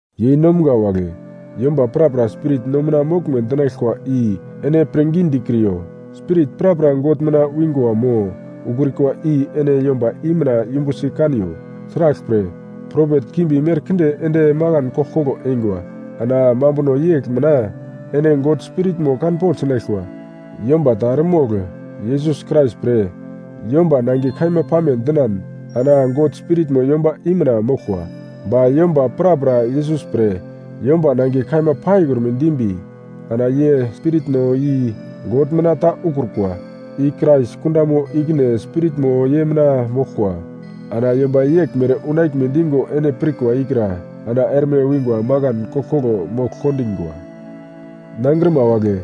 Yeinomga wagle, yomba prapra spirit no mina moglme dinaglkwa i ene pirngi dikriyo. Spirit prapra God mina wingwa mo ukrikwa i ene yomba i mina yumbusi kaniyo. Sraglpre, propet kimbi merkinde ende makan koglkoglo eingwa. Ana mambuno yegl mina ene God Spiritmo kanpogl sinaglkwa: Yomba ta eremogl Yesus Krais pre, ‘yomba nangiye kaima pame’ dinan ana God Spiritmo yomba i mina moglkwa. Ba yomba prapra Yesus pre ‘Yomba nangiye kaima’ paikrume dimbi ana ye spiritno i God mina ta ukrukwa. I Krais kundamo ikine spiritmo ye mina moglkwa. Ana yomba yeglmere unaglme digo ene pirkwa ikra ana erme wingwa makan koglkoglo mogl kondingwa. Nangrima wagle,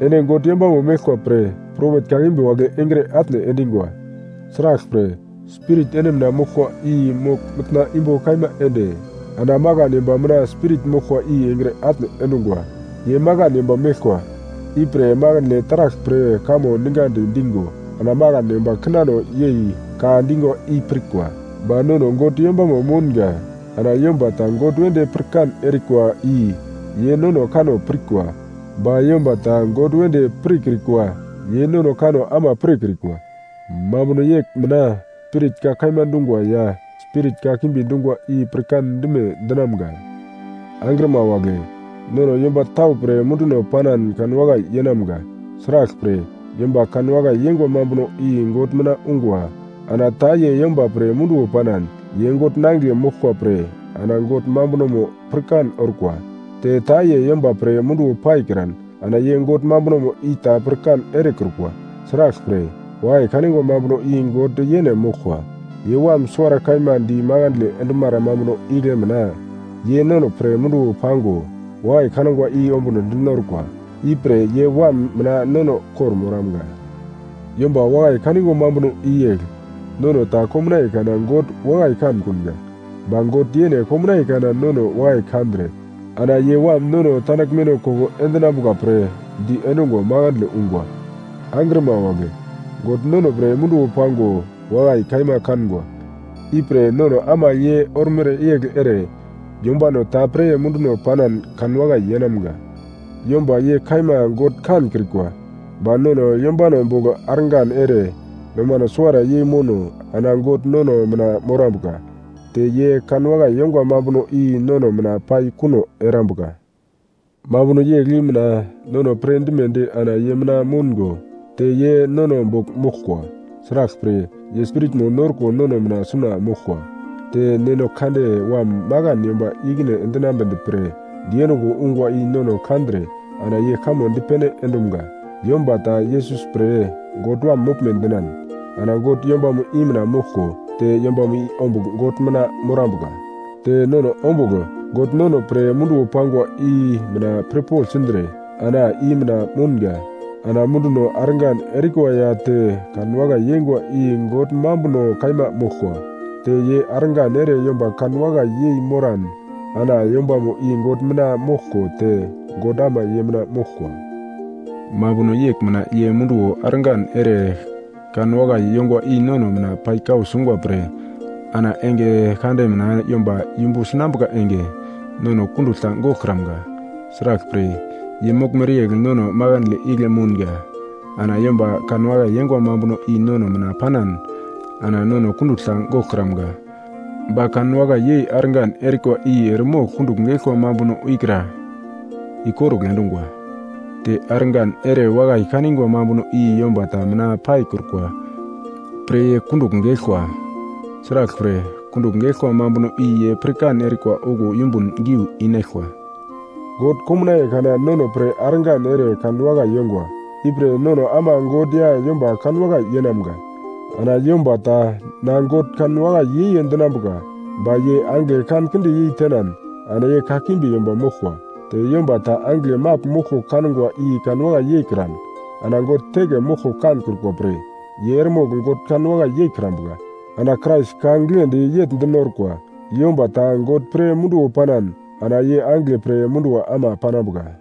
ene God yombamo meglkwa pre propet kakimbi wagle engre atne endingwa. Sraglpre, Spirit ene mina moglkwa i mogl mitna imbo kaima ende ana makan yomba mina spirit moglkwa i engre atne endungwa. Ye makan yomba meglkwa, ipre makandle taragl pre kamo ningadi digo ana makan yomba kinano yei ka dingwa i pirkwa. Ba nono God yombamo moungo ana yomba ta God wedi pirkan erikwa i ye nono kanno pirkwa. Ba yomba ta God wedi pirkrikwa ye nono kanno ama pirkrikwa. Mambuno yegl mina Spirit ka kaima dungwa ya spirit kakimbi dungwa i pirkan dime dinamga. Angrima wagle, nono yomba tau pre munduno panan kanwakai yeinamga. Sraglpre, yomba kanwakai yengwa mambuno i God mina ungwa. Ana ta ye yomba pre munduwo panan, ye God nangigle moglkwa pre ana God mambunomo pirkan orkwa. Te ta ye yomba pre munduwo paikran ana ye God mambunomo i ta pirkan erekrukwa. Sraglpre, wakai kanigwa mambuno i God yene moglkwa. Ye Wam suwara kaima di makandle endumara mambuno igle mina, ye nono pre munduwo pango wakai kangwa i ombunodi norkwa. Ipre ye Wam mina nono kor-moramga. Yomba wakai kanigwa mambuno i yegl: Nono ta komnaiye kana God wakai kankunga, ba God yene komnaiye kana nono wakai kandre ana ye Wam nono tandaglmeno koko endinambuka pre di endungo makandle ungwa. Angrima wagle, God nono pre munduwo pango wakai kaima kangwa, ipre nono ama ye ormere yegl ere yombano ta pre munduno panan kanwakai yeinamga. Yomba ye kaima God kankrikwa, ba nono yombano bogl argan ere nomano suwara yei mouno ana God nono mina morambuka. Te ye kanwakai yongwa mambuno i nono mina pai kuno erambuka. Mambuno yegl i mina nono pirdimedi ana ye mina moungo te ye nono bogl moglkwa. Sraglpre, ye Spiritmo norko nono mina suna moglkwa. Te Neno Kande Wam makan yomba i-ikine endinambedi pre diendungo ungwa i no kandre ana ye kamo dipene endumga. Yomba ta Yesus pre God Wam moglme dinan, ana God yombamo i mina moglko te yombamo i ombugl God mina morambuka. Te nono ombugl God nono pre munduwo pangwa i mina pirpogl sindre ana i mina mounga. Ana munduno argan erikwa ya te kanwakai yengwa i God mambuno kaima moglkwa. Ta ye argan ere yomba kanwakai yei moran ana yombamo i God mina moglko te God ama ye mina moglkwa. Mambuno yegl mina ye munduwo argan ere kanwakai yongwa i nono mina pai kau sungwa pre ana enge kande mina yomba yumbu sinambuka enge nono kundugl ta goglkramga. Sraglpre, ye moglmere yegl nono makandle igle mounga. Ana yomba kanwakai yeingwa mambuno i nono mina panan ana nono kundugl ta goglkramga. Ba kanwakai yei argan erikwa i eremogl kundugl geglkwa mambuno ikra ikorugl endungwa. Te argan erewakai kanigwa mambuno i yomba ta mina paikrukwa pre ye kundugl geglkwa. Sraglpre, kundugl geglkwa mambuno i ye pirkan erikwa okuwo yumbun giu inaglkwa. God komnaiye kana nono pre argan ere kanwakai yongwa, ipre nono ama God ya yomba kanwakai yeinamga. Ana yomba ta na God kanwakai yei ye dinambuka, ba ye angigle kankinde yei tenan ana ye kakimbi yomba moglkwa. Te yomba ta angigle magl moglko kangwa i kanwakai yeikran ana God teke moglko kankrukwa pre ye eremogl God kanwakai yeikrambuka. Ana Krais ka giglendi yegl dinorkwa: Yomba ta God pre munduwo panan ana ye angigle pre munduwo ama panambuka.